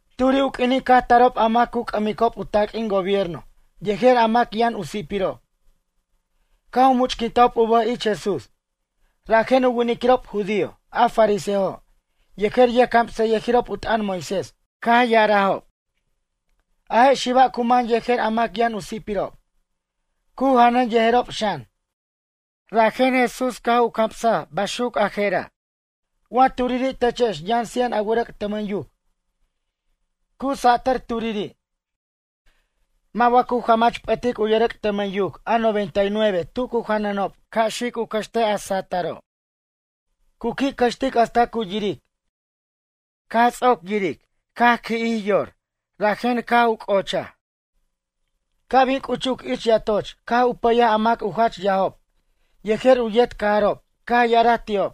Turi' u q'uinin caj tarob a mac cu c'ʌmicob u taq'uin gobierno yejer a mac yʌn u si'pirob. Caj u much'quintajob u bʌj ich Jesús. Rajen u winiquirob judío a fariseojo' yejer yʌjcamsayʌjirob u t'ʌn Moisés caj ya'arajob: ―A je' xiba' cu man yejer a mac yʌn u si'pirob, cu janʌn yejerob xan. Rajen Jesús caj u camsaj baxuc a je'ra': ―Wa turiri' techex yʌn cien a wʌrʌc' tʌmʌn yuc, cu satʌr turiri', mʌ' wa cu jamach p'ʌtic u yʌrʌc' tʌmʌn yuc a noventa y nueve tu cu janʌnob ca' xic u cʌxtej a sa'ataro'? Cu qui' cʌxtic hasta cu yiric. Caj ts'oc yiric caj qui'jij yor rajen caj u c'ocha. Ca' bin c'uchuc ich yatoch caj u pʌyaj a mac u jach yajob yejer u yet cajarob caj ya'araj ti'ob: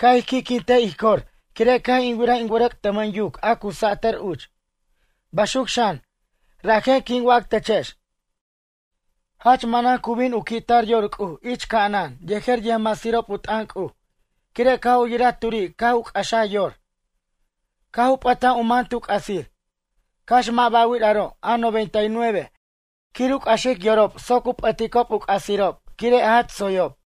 “Ca' ij qui'quintej ij cor quire' caj in wiraj in wʌrʌc' tʌmʌn yuc a cu satʌr uch.” Baxuc xan, rajen quin wac techex: Jach manan cu bin u qui' tar yor C'uj ich ca'anan yejer yʌjmasirob u t'ʌn C'uj quire' caj u yiraj turi' caj u c'axaj yor, caj u p'ʌtaj u man tu c'asir. Cax mʌ' ba'wir aro' a noventa y nueve quir u c'axic yorob soc u p'ʌticob u c'asirob quire' jach tsoyob.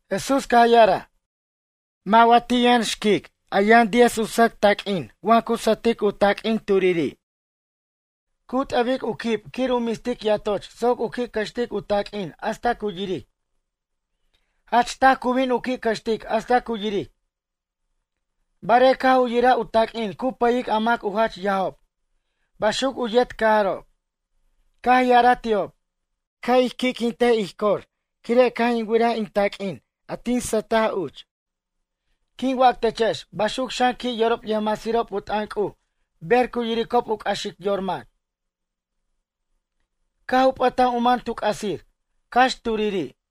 Jesús caj ya'araj: ―Mʌ' wa ti' yʌn xquic a yʌn diez u sʌc taq'uin wa cu sʌtic u taq'uin turiri'. Cu t'ʌbic u quib quir u mistic yatoch soc u qui' cʌxtic u taq'uin hasta cu yiric. Jach taj cu bin u qui' cʌxtic hasta cu yiric. Barej caj u yiraj u taq'uin cu pʌyic a mac u jach yajob. Baxuc u yet cajarob, caj ya'araj ti'ob: “Ca' ij qui'quintic ij cor quire' caj in wiraj in taq'uin a tin sʌtaj uch.” Quin wac techex baxuc xan qui' yorob yʌjmasirob u t'ʌn C'uj ber cu yiricob u c'axic yor mac. Caj u p'ʌtaj u man tu c'asir, cax turiri'.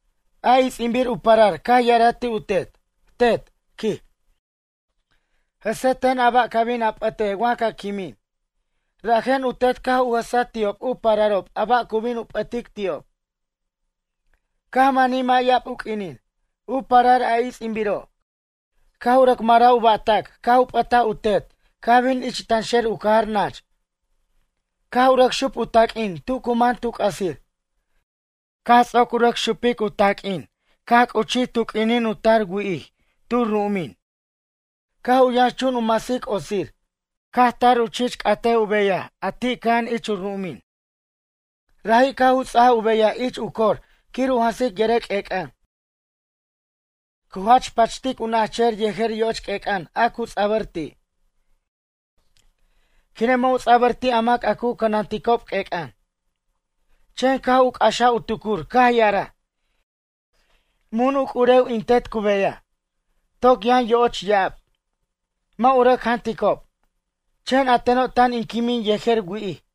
A its'inbir u parar caj ya'araj ti' u tet: “Tet ―quij―, jʌse ten a ba' ca bin a p'ʌtej wa ca quimin.” Rajen u tet caj u jʌsaj ti'ob u pararob a ba' cu bin u p'ʌtic ti'ob. Caj manij mʌ' ya'ab u q'uinin, u parar a its'inbiro' caj u rʌc maraj u ba'tac caj u p'ʌtaj u tet caj bin ich tanxer u cajar nach. Caj u rʌc xup u taq'uin tu cu man tu c'asir. Caj ts'oc u rʌc xupic u taq'uin caj c'uchij tu q'uinin u tar wi'ij tu ru'umin. Caj u yʌnxchun u masic otsir. Caj tar u chich c'ataj u beyaj a ti' cʌja'an ich u ru'umin. Raji' caj u ts'aj u beyaj ich u cor quir u jansic yʌrʌc' q'uec'an. Cu jach pachtic u najchʌjʌr yejer yoch q'uec'an a cu ts'abʌr ti'. Quire' mʌ' u ts'abʌr ti' a mac a cu cʌnanticob q'uec'an. Chen caj u c'axaj u tucur caj ya'araj: “Mun u c'urew in tet cu beyaj. Toc yʌn yo'och ya'ab. Mʌ' u rʌc janticob. Chen a teno' tan in quimin yejer wi'ij.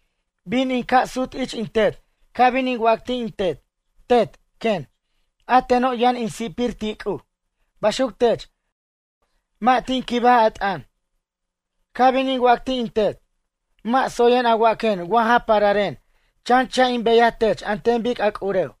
Bin in ca' sut ich in tet ca' bin in wac ti' in tet: Tet, quen, a teno' yʌn in si'pir ti' C'uj. Baxuc tech, mʌ' tin quibaj a t'ʌn. Ca' bin in wac ti' in tet: Mʌ' tsoyen a waquen wa ja pararen. Chan cha' in beyaj tech an ten bic a c'urew.”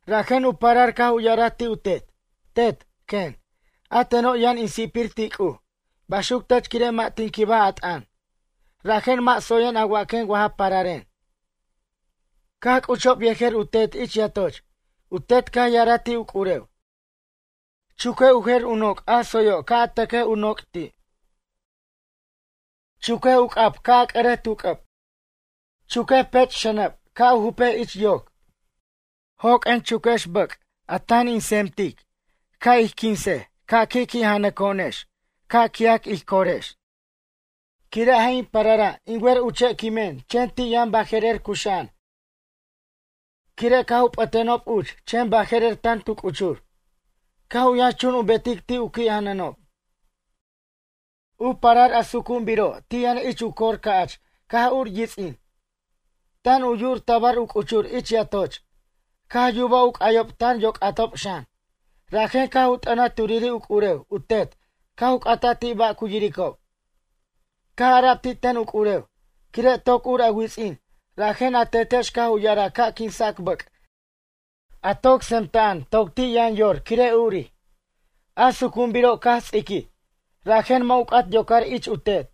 Rajen u parar caj u ya'araj ti' u tet: “Tet, quen, a teno' yʌn in si'pir ti' C'uj. Baxuc tech quire' mʌ' tin quibaj a t'ʌn. Rajen mʌ' tsoyen a waquen wa ja pararen.” Caj c'uchob yejer u tet ich yatoch. U tet caj ya'araj ti' u c'urew: “Chuquej u jer u noc' a tsoyo' ca' a tʌquej u noc' ti'. Chuquej u c'ʌb ca' a c'ʌrej tu c'ʌb. Chuquej u pech' xʌnʌb ca' a jupej ich yoc. Joq'uen chuque bʌc' a tan ic tsentic ca' ij quinsej ca' ij qui' janʌnex ca' qui'ac ij corex. Quire' a je' in parara' in wer uche' quimen chen ti' yʌn baje'rer cuxa'an quire' caj u p'ʌtenob uch chen baje'rer tan tu c'uchur.” Caj u yʌnxchun u betic ti' u qui' janʌnob. ’U parar a sucu'unbiro' ti' yʌn ich u cor ca'ch caj ur u yits'in. Tan u yu'ur tabar u c'uchur ich yatoch. Caj yubaj u c'ayob tan yoc'atob xan. Rajen caj u t'ʌnaj turiri' u c'urew u tet caj u c'ata ti' ba' cu yiricob. Caj ara'b ti' ten u c'urew: “Quire' toc ur a wits'in rajen a tetex caj u ya'araj ca' quinsac bʌc' a toc tsemta'an toc ti' yʌn yor quire' urij.” A sucu'unbiro' caj ts'iquij, rajen mʌ' u c'at u yocar ich u tet.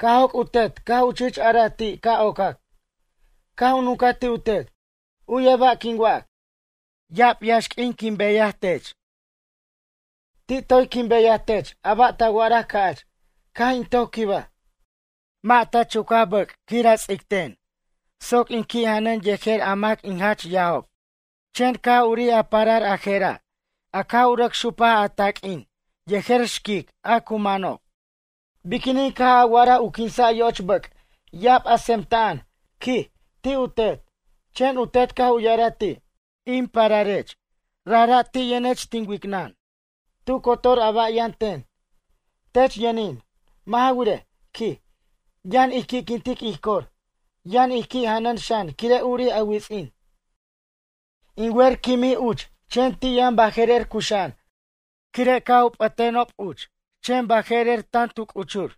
Caj joc' u tet caj u chich araj ti' ca' ocac. Caj u nuncaj ti' u tet: “U'yej ba' quin wac. Ya'ab yaxq'uin caj in beyaj tech. Ti' toy quin beyaj tech a ba' ta wa'araj ca'ch, caj in toc quibaj. Mʌ' ta chuca bʌc' teni', a ts'aten mʌ' chichin soc in qui' janʌn yejer a mac in jach yajob. Chen caj urij a parar a je'ra' a caj u rʌc xupaj a taq'uin yejer xquic a cu manob. Biquinin caj a wa'araj u quinsa' yoch bʌc' ya'ab a tsemta'an ―quij―, ti' u tet?” Chen u tet caj u ya'araj ti': “In pararech. Rajra' ti' yʌnech tin wicnʌn. Tu cotor ba' a yʌn ten, tech yʌnin. Mʌ' ja wirej ―quij―, yʌn ij qui'quintic ij cor. Yʌn ij qui' janʌn xan quire' urij a wits'in. In wer quimij uch chen ti' yʌn baje'rer cuxa'an quire' caj u p'ʌtʌnenob uch chen baje'rer tant u c'uchur.”